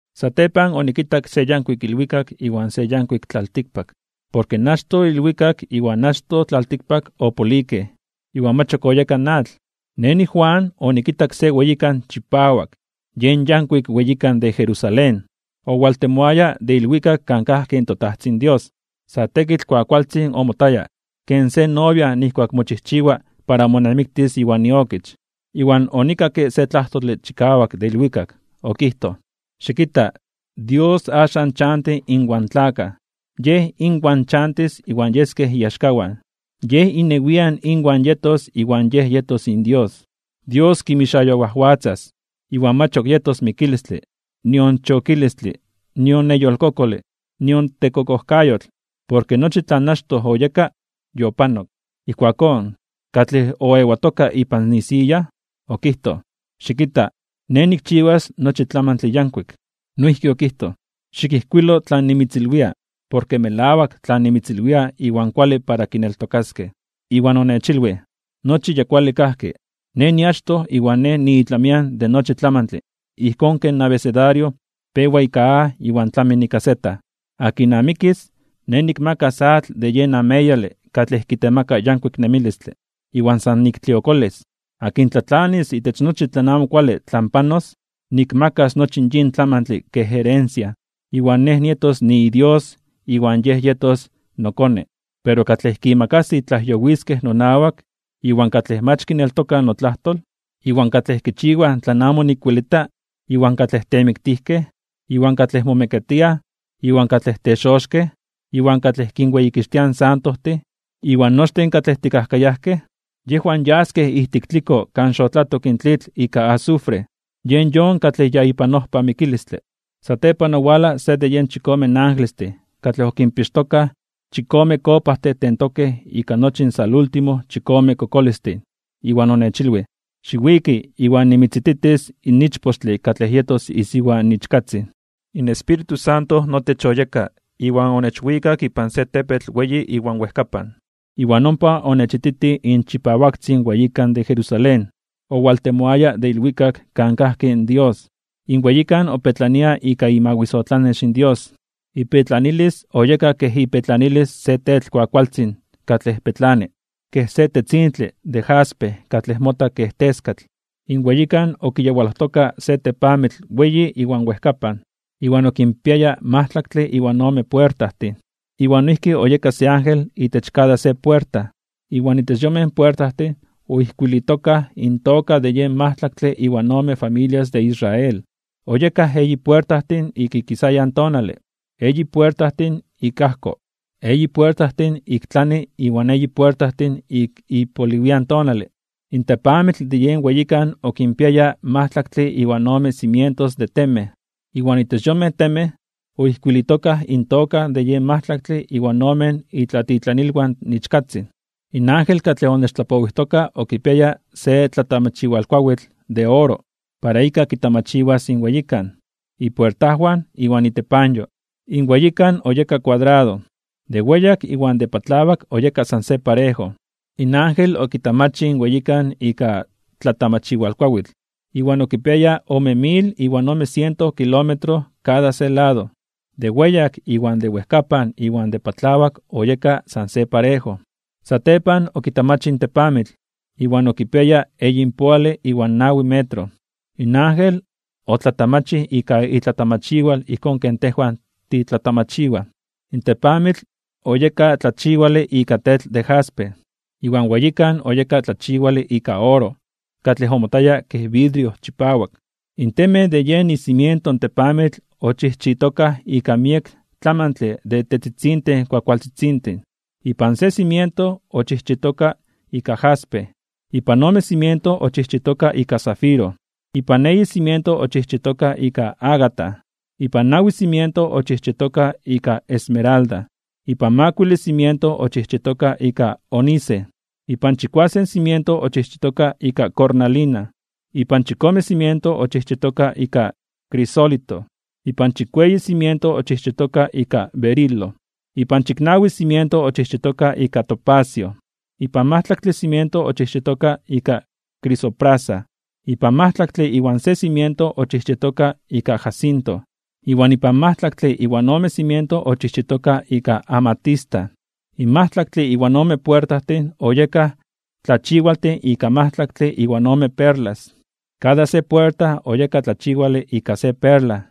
Satepan onikitak se yankuik ilwikak iwan se yankuik tlaltikpak. Porke in achtoj ilwikak iwan achtoj tlaltikpak opolikej, iwan mach ok oyeka in atl. Nej niJuan, onikitak se weyikan chipawak, yen yankuik weyikan de Jerusalén, owaltemoaya de ilwikak kan kajki in toTajtzin Dios. Sa tekitl kuakualtzin omotaya ken se novia nijkuak mochijchiwa para monamiktis iwan iokich. Iwan onikakke se tlajtole chikawak de ilwikak. Okijtoj: ―Xikita. Dios axan chanti inwan tlakaj. Yej inwan chantis iwan yeskej iaxkawan, Yej inewian inwan yetos iwan Yej yetos inDios. Dios kinmixayowajwatzas, iwan mach ok yetos mikilistle, nion chokilistle, nion neyolkokole, iwan nion tekokojkayotl, porke nochi tlan achtoj oyeka, yopanok. Ijkuakón katlej oewatoka ipan isiya, okijtoj: ―Xikita. Nej nikchiwas nochi tlamantle yankuik. Noijki okijtoj: ―Xikijkuilo tlan nimitzilwia, porke melawak tlan nimitzilwia iwan kuale para kineltokaskej. Iwan onechilwij: ―Nochi ya kuale kajki. Nej niachtoj iwan Nej niitlamian de nochi tlamantle ijkón ken abecedario pewa ika A iwan tlami ika Z. Akin amikis, Nej nikmakas atl de yen ameyale katlej kitemaka yankuik nemilistle, iwan san niktliokolis. Akin tlatlanis itech nochi tlan amo kuale tlan panos, nikmakas nochi yin tlamantle kej herencia. Iwan Nej nietos niiDios iwan yej yetos nokone. Pero katlej kimakasij tlajyowiskej nonawak, iwan katlej mach kineltokaj notlajtol, iwan katlej kichiwaj tlan amo nikwelita, iwan katlej temiktijkej, iwan katlej momekatiaj, iwan katlej texoxkej (brujojtij), iwan katlej kinweyikixtiaj in santojtin, iwan nochtin katlej tekajkayajkej, yejwan yaskej ijtik tliko kan xotlatok in tlitl ika azufre. Yen yon katlej ya ipan ojpa mikilistle. Satepan owalaj se de yen chikome angelestin katlej okinpixtokaj chikome kopajtin tentokej ika nochi in salúltimo chikome kokolistin. Iwan onechilwij: ―Xiwiki, iwan nimitzititis in ichpochtle katlej yetos isiwa in Ichkatzin. In Espíritu Santo notech oyeka iwan onechwikak ipan se tepetl weyi iwan wejkapan, iwan ompa onechititij in chipawaktzin weyikan de Jerusalén, owaltemoaya de ilwikak kan kajki in Dios. In weyikan opetlania ika imawisotlanex Dios. Ipetlanilis oyeka kej ipetlanilis se tetl kuakualtzin katlej petlani, kej se tetzintle de jaspe katlej mota kej teskatl. In weyikan okiyawalojtoka se tepamitl weyi iwan wejkapan, iwan okinpiaya majtlaktle iwan ome puertajtin, iwan noijki oyeka se ángel itech kada se puerta. Iwan itech yonmej puertajtin oijkuilitokaj intoka de yen majtlaktle iwan ome familias de Israel. Oyekaj eyi puertajtin ik ikisayan tonale, eyi puertajtin ik ajko, eyi puertajtin ik tlani iwan eyi puertajtin ik ipoliwian tonale. In tepamitl de yen weyikan okinpiaya majtlaktle iwan ome cimientos de temej, iwan itech yonmej temej oijkuilitokaj intoka de yen majtlaktle iwan omen itlatitlanilwan in Ichkatzin. In ángel katlej onechtlapowijtoka okipiaya se tlatamachiwalkuawitl (metro) de oro, para ika kitamachiwas in weyikan, ipuertajwan iwan itepanyo. In weyikan oyeka kuadrado. De weyak iwan de patlawak oyeka san se parejo. In ángel okitamachij in weyikan ika tlatamachiwalkuawitl, iwan okipiaya ome mil iwan ome siento kilómetro kada se lado. De weyak iwan de wejkapan iwan de patlawak oyekaj san se parejo. Satepan okitamachij in tepamitl, iwan okipiaya eyinpoale iwan nawi metro. In ángel otlatamachij ika itlatamachiwal ijkón ken tejwan titlatamachiwaj. In tepamitl oyeka tlachiwale ika tetl de jaspe, iwan weyikan oyeka tlachiwale ika oro katlej omotaya kej vidrio chipawak. In temej de yen icimiento in tepamitl ochijchitokaj ika miek tlamantle de tetzitzintin kuakualtzitzintin. Ipan se cimiento ochijchitoka ika jaspe, ipan ome cimiento ochijchitoka ika zafiro, ipan eyi cimiento ochijchitoka ika ágata, ipan nawi cimiento ochijchitoka ika esmeralda, ipan makuile cimiento ochijchitoka ika ónice, ipan chikuasen cimiento ochijchitoka ika cornalina, ipan chikome cimiento ochijchitoka ika crisólito, ipan chikueyi cimiento ochijchitoka ika berilo, ipan chiknawi cimiento ochijchitoka ika topacio, ipan majtlaktle cimiento ochijchitoka ika crisoprasa, ipan majtlaktle iwan se cimiento ochijchitoka ika jacinto, iwan ipan majtlaktle iwan ome cimiento ochijchitoka ika amatista. In majtlaktle iwan ome puertajtin oyekaj tlachiwaltin ika majtlaktle iwan ome perlas. Kada se puerta oyeka tlachiwale ika se perla.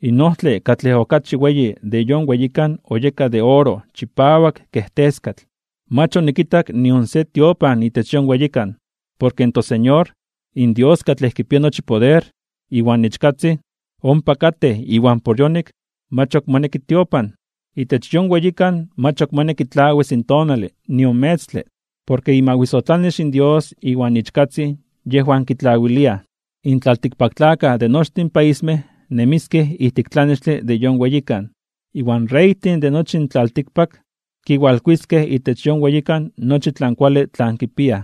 In ojtle katlej okachi weyi de yon weyikan oyeka de oro chipawak kej teskatl. Mach onikitak nion se tiopan itech yon weyikan, porke in toSeñor, in Dios katlej kipia nochi poder, iwan Ichkatzin, ompa katej iwan por yonik mach ok moneki tiopan. Itech yon weyikan mach moneki tlawis in tonale nion metztle, porke imawisotlanex in Dios iwan Ichkatzin yejwan kitlawiliaj. In tlaltikpaktlakaj de nochtin paismej nemiskej ijtik tlanextle de yon weyikan. Iwan in reytin de nochi in tlaltikpak kiwalkuiskej itech yon weyikan nochi tlan kuale tlan kipiaj.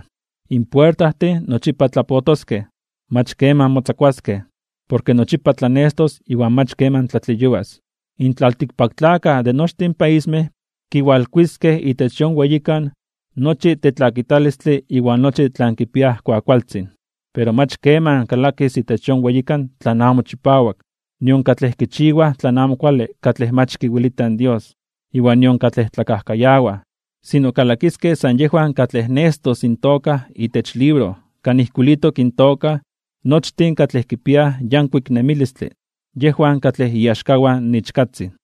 In puertajtin nochipa tlapotoskej. Mach keman motzakuaskej. Porke nochipa tlanestos iwan mach keman tlatleyuas. In tlaltikpaktlakaj de nochtin paismej kiwalkuiskej itech yon weyikan nochi tetlakitalistle iwan nochi tlan kipiaj kuakualtzin. Pero mach keman kalakis itech yon weyikan tlan amo chipawak, nion katlej kichiwaj tlan amo kuale katlej mach kiwelita in Dios, iwan nion katlej tlakajkayawaj. Sino kalakiskej san yejwan katlej nestos intoka itech libro kan ijkuilitok intoka nochtin katlej kipiaj yankuik nemilistle, yejwan katlej iaxkawan in Ichkatzin.